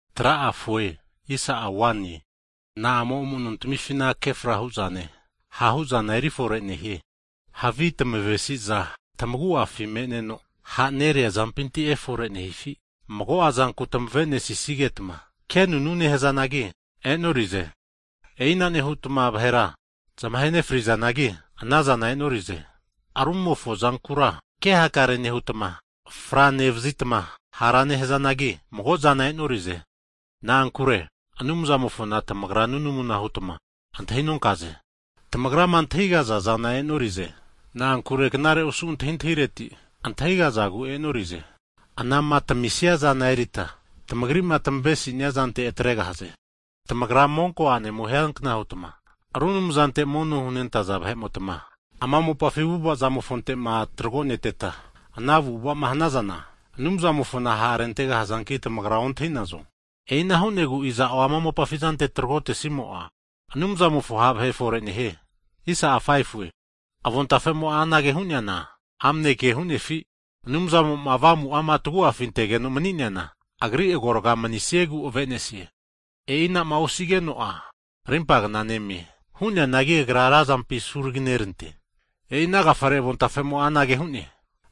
Hagi na'amo amu'nontamifina kefra hu'zane, ha' hu'zana eri forenehie? Havi tamavesi'za tamagu'afi me'neno ha'nerea zampinti efore nehifi? Mago'a zanku tamave'nesigetma kenunu nehazanagi e'norize. E'ina nehutma vahera zamahe nefrizanagi anazana e'norize. Rumofo zankura ke hakare nehutma franevazitma hara nehazanagi, mago'zana e'nori'ze. Na'ankure Anumzamofona tamagra nunamuna hutma antahinonkaze. Tamagrama antahigaza zana e'norize, na'ankure knare osu antahintahireti antahigazagu e'norize. Anama tamisia zana eritma tamagrima tamavenesia zante atregahaze. Tamagra monko a'nemo hiankna hutma, ru anumzante mono hunentaza vahe'motma, ama mopafi avu'avazamofonte'ma tragoneteta ana avu'ava'ma hanazana, Anumzamofona ha'rentegahazanki tamagra ontahi'nazo? E'ina hu'negu iza'o ama mopafi zante tragotesimo'a, Anumzamofo ha' vahe fore nehie. Avontafemo'a anage hu'neana, amne ke hu'nefi? Anumzamo'ma Avamu'ama tagu'afi antegeno mani'neana, Agri agorga manisiegu avenesie. E'ina'ma osigeno'a rimpagna nemie. Hu'neanagi agra razampi asuraginerante, e'ina agafare avontafemo'a anage hu'ne,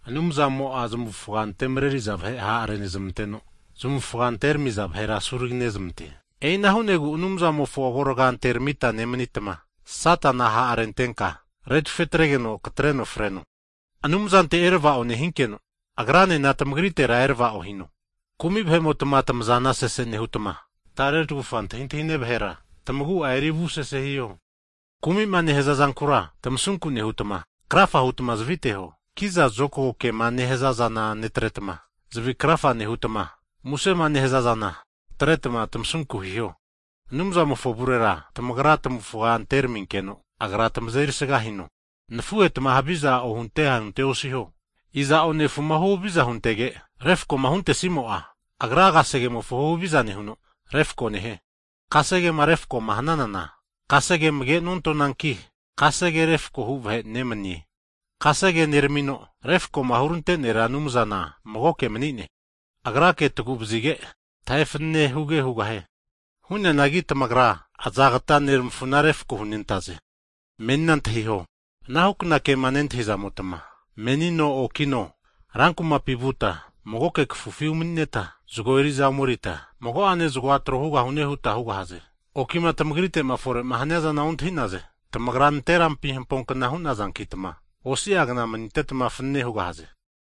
Anumzamo'a zamufga antemareriza vahe ha'renezmanteno, zamufga anteneramiza vahera asuraginezmante. E'ina hu'negu Anumzamofo agorga anteramita nemanitma, Satana ha'renteta retufe atrenkeno tamatreno freno. Anumzante erava'o hinkeno, Agranena tamagaritera erava'o hino. Kumi vahe'motma tamazana sese nehutma, tare tagufa antahintahine vahera tamagu'a eri avusese hiho. Kumima nehaza zankura tamasunku nehutma, krafa hutma zaviteho. Kiza zokagoma nehazazana netretma, zavi krafa nehutma musema nehaza zana atretma tamasunku hiho. Anumzamofo avurera tamagra tamavufga anteraminkeno, Agra tamazeri sga hino. Hagi nafuhetma, huhaviza ohunte ahunte osiho. Iza'o nefuma huhaviza huntege refakoma huntesimo'a, agra kasegemofo huhaviza nehuno, refako nehie. Kasegema refako'ma hananana, kasegea amage nontananki, kasege refako hu vahe nemanine. Kasege neramino, refakoma hurante Nera Anumzana magoke mani'ne, Agrake tagu'vazige, tahe fanane huge hugahie. Hu'neanagi tamagra azagata neramafuna refako hunentaze? Hagi menina antahiho, anahukna kema nehazamotma, menino okino rankumapi vuta, mago kafufi umanineta, zago eri'za omerita, mago'ane zagoa (win moni) trohugahune huta hugahaze. Hagi okima tamagrite'ma fore'ma haniazana ontahi'naze. Tamagra nanterampi hamponkna hu'nazankitma osi'a kna manitetma fanane hugahaze.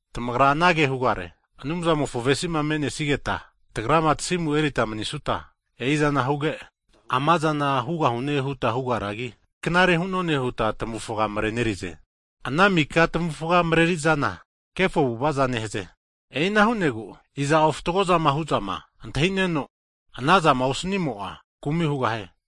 Tamagra anage hugare, Anumzamofo avesi'ma me'nesigeta, tagrama tasimu erita manisuta, e'izana huge, amazana hugahune huta hugaragi, knare hu'none hutma tamufaga marenerize. Ana mika tamufga mareri'zana kefo avu'ava'za nehaze. E'ina hu'negu, iza'o fatgozama hu'zama antahineno, anazama osanimo'a kumi hugahie.